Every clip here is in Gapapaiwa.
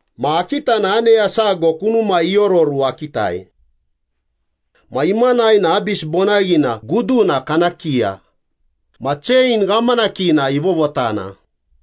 Ma akita na aneya sago kunumai iororu akitai. Ma imanai na Abis bonaghina guduna kana kiya ma chein ghamanakina ivovotana.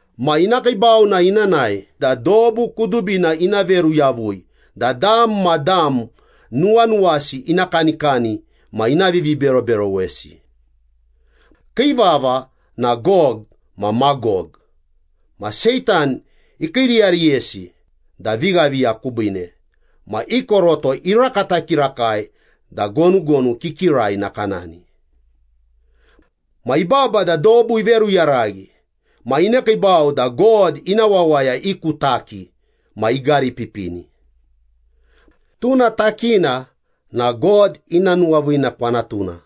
Ma ina kiibau na ina nae da dobu kudubina ina veru yavui da dam ma dam nuwanuwasi ina kanikani ma ina viviberoberowesi. Kii vava na Gog ma Magog ma Seitan ikiiriyariyesi da vighaviya kubiine ma i koroto irakata kirakai da gonugonu kikirai nakanani. Ma ibaba da dobu iveruyaraghi ma inekiibau da God ina wawaya i ku taki ma igaripipini. Tuna takina na God ina nuwaviina kwanatuna.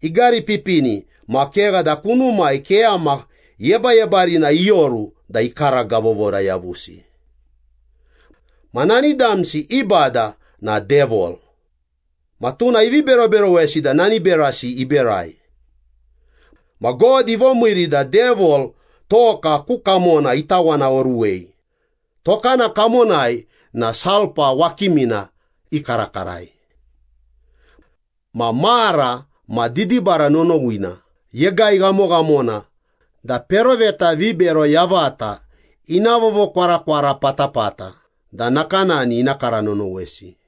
Igaripipini ma kegha da kunumai keyama yebayebarina ioru da ikaragavovora yavusi. Ma nani damsi i bada na Devil, ma tuna ivi beroberowesi da nani berasi iberai. Ma God ivomiiri da Devil toka ku kamona itawanaoruwei, tokana kamonai na sulpa wakimina ikarakarai. Ma mara ma didibara nonowina yegai ghamoghamona da peroveta vibero yavata ina vovokwarakwara patapata da nakanani ina kara nonowesi.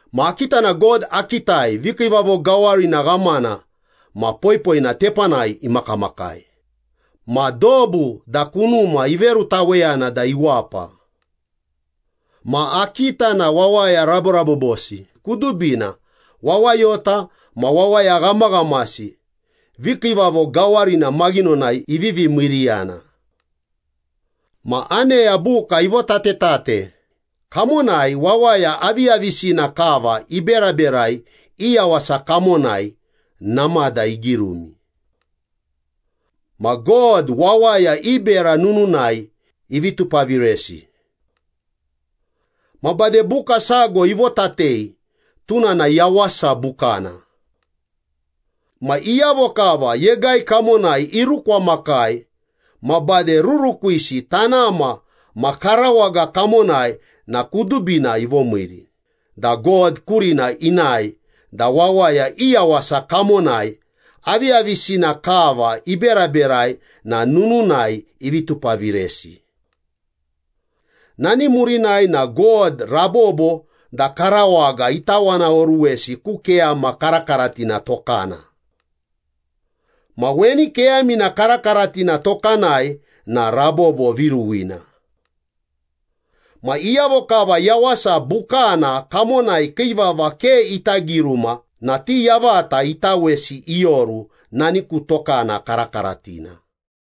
Ma akita na God akitai vikiivavo gawarina ghamana ma poipoina tepanai imakamakai, ma dobu da kunuma iverutaweyana da iwapa. Ma akita na wawaya raborabobosi kudubina, wawayota ma wawaya ghamaghamasi vikiivavo gawarina maghinonai ivivi miiriyana. Ma aneya buka ivotatetate, kamonai wawaya aviyavisina kava iberaberai i yawasa kamonai namada igirumi. Ma God wawaya i bera nununai ivi tupaviresi. Ma bade buka sago ivotatei tuna na Yawasa Bukana. Ma iyavo kava yegai kamonai irukwamakai ma bade rurukwisi tanama ma karawaga kamonai na kudubina ivomiiri da God kurina inae da wawaya i yawasa kamonai aviyavisina kava iberaberai na nununai ivi tupaviresi. Nani murinai na God rabobo da karawaga itawanaoruwesi ku keyama karakaratina tokana. Ma weni keyamina karakaratina tokanai na rabobo viruwina. Ma iyavo kava Yawasa Bukana kamonai kii vava ke ita giruma na ti yavata itawesi ioru nani ku tokana karakaratina.